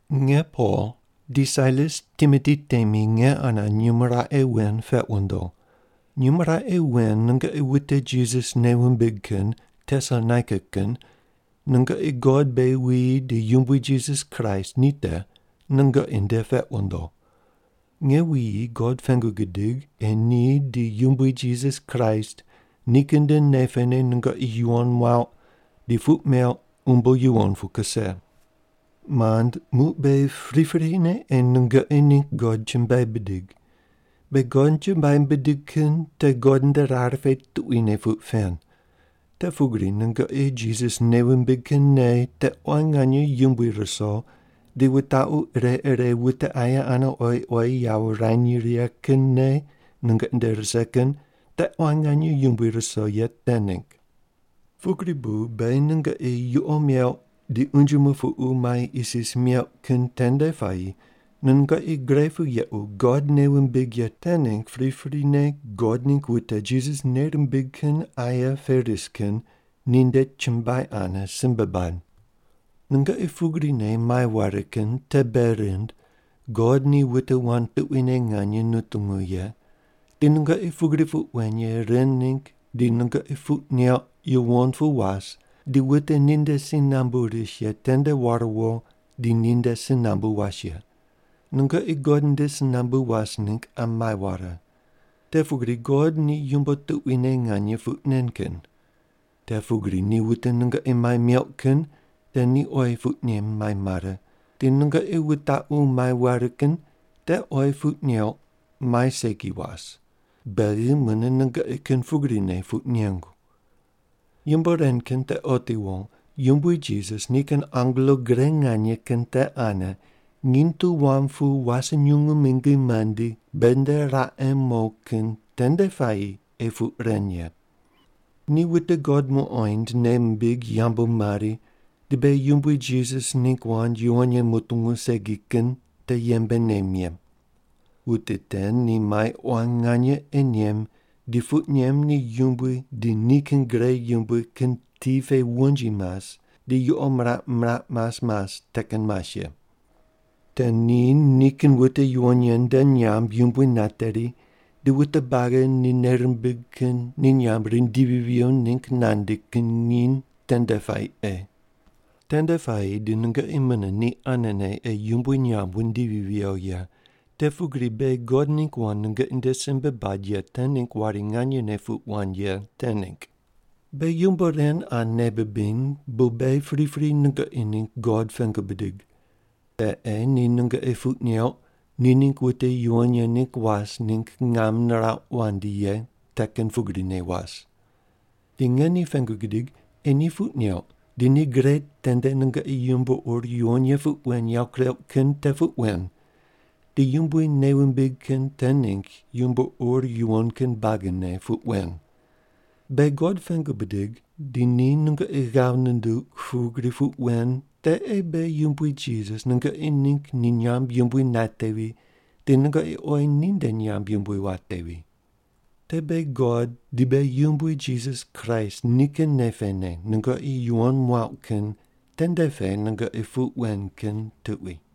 Nge Pol di Sailas Timoti temi nge ane nyumo raqe wen peq wundo. Nyumo raqe wen nungoqi wute Jisas nei wumbig kin Tesalonaika kin, nungoqi God beghi wuyi di Yumbui Jisas Kraist ni te, nungoqi nde peq wundo. Nge wuyi God pengu gidig ei ni di Yumbui Jisas Kraist nikin nde nei pene nungoqi yuwon muauq di puq meuq umbo yuwon pu kuse. Mand, muq beghi priprine ei nungoqi ningg God chumbuai bidig. Beghi God chumbuai bidig kin te God nde rar pe tuquine puq pen, te pugri nungoqi Jisas nei wumbig kin nei te quan nganye yumbui ruso di wutaqu ire ire wute aye ane oyi oyi yawo wurany righe kin nei nungoqi nde rise kin te quan nganye yumbui ruso ye te ningg. Pugri bu beghi nungoqi yuqo meuq di unje mupuqu mai isis meuq kin tende puayi nungoqi gre pu yequ God nei wumbig ye te ningg priprine God ningg wute Jisas nei rimbig kin aye pe ris kin ninde chumbuai ane simbe bad. Nungoqi pugrine mai ware kin te bei rind God ni wute wand tuquine nganye nutungu ye, di nungoqi pugri puq wen ye ren ningg di nungoqi puq neuq yuwon pu was di wute ni nde si nambu ris ye tende war wo di ni nde si nambu was ye. Nungoqi God nde si nambu was ningg qa mai ware. Te pugri God ni yumbo tuquine nganye puq nen kin. Te pugri ni wute nungoqi mai meuq kin te ni oyi puq nem mai mare, di nungoqi wutaqu mai ware kin te oyi puq neuq mai segi was, beghi mune nungoqi kin pugrine puq nengu. Yumbo ren kin te otiwo Yumbui Jisas nikin angelo gre nganye kin te ane nginy tu wam pu wase nyungu mingi mandi beghi nde raqe mo kin tende puayi ei puq ren ye. Ni wute God muqoind nei mimbig yambu mari di beghi Yumbui Jisas ningg wand yuwon ye mutungu segi kin te yembe nem ye. Wute te ni mai quan nganye ei nem di puq nem ni Yumbui di nikin gre yumbui kin ti pe wonji mas di yuqo miraq miraq mas mas te kin mas ye. Te ni nikin wute yuwon ye nde nyamb yumbui nateri di wute buagi ni nei rimbig kin ni nyamb rindivi viyo ningg nandi kin nginy tende puayi ei. Tende puayi di nungoqi mune ni anene ei Yumbui nyamb wundivi viyo ye, te pugri beghi God ningg wand nungoqi nde simbe bad ye te ningg wari nganyene puq wand ye te ningg. Beghi yumbo ren qa nei bibiny bu beghi pripri nungoqi ningg God pengu bidig. Te ei ni nungoqi puq neuq ni ningg wute yuwon ye ningg was ningg ngam nirauq wandi ye te kin pugrine was. Di nge ni pengu gidig ei ni puq neuq di ni gre tende nungoqi yumbo ur yuwon ye puq wen yawo kureuq kin te puq wen, di Yumbui nei wumbig kin te ningg yumbo ur yuwon kin buagine puq wen. Beghi God pengu bidig di ni nungoqi ghav nunduq pugri puq wen te ei beghi Yumbui Jisas nungoqi ningg ni nyamb yumbui natevi di nungoqi oyi ninde nyamb yumbui watevi. Te beghi God di beghi Yumbui Jisas Kraist nikin nei pene nungoqi yuwon muauq kin tende pe nungoqi puq wen kin tuqui.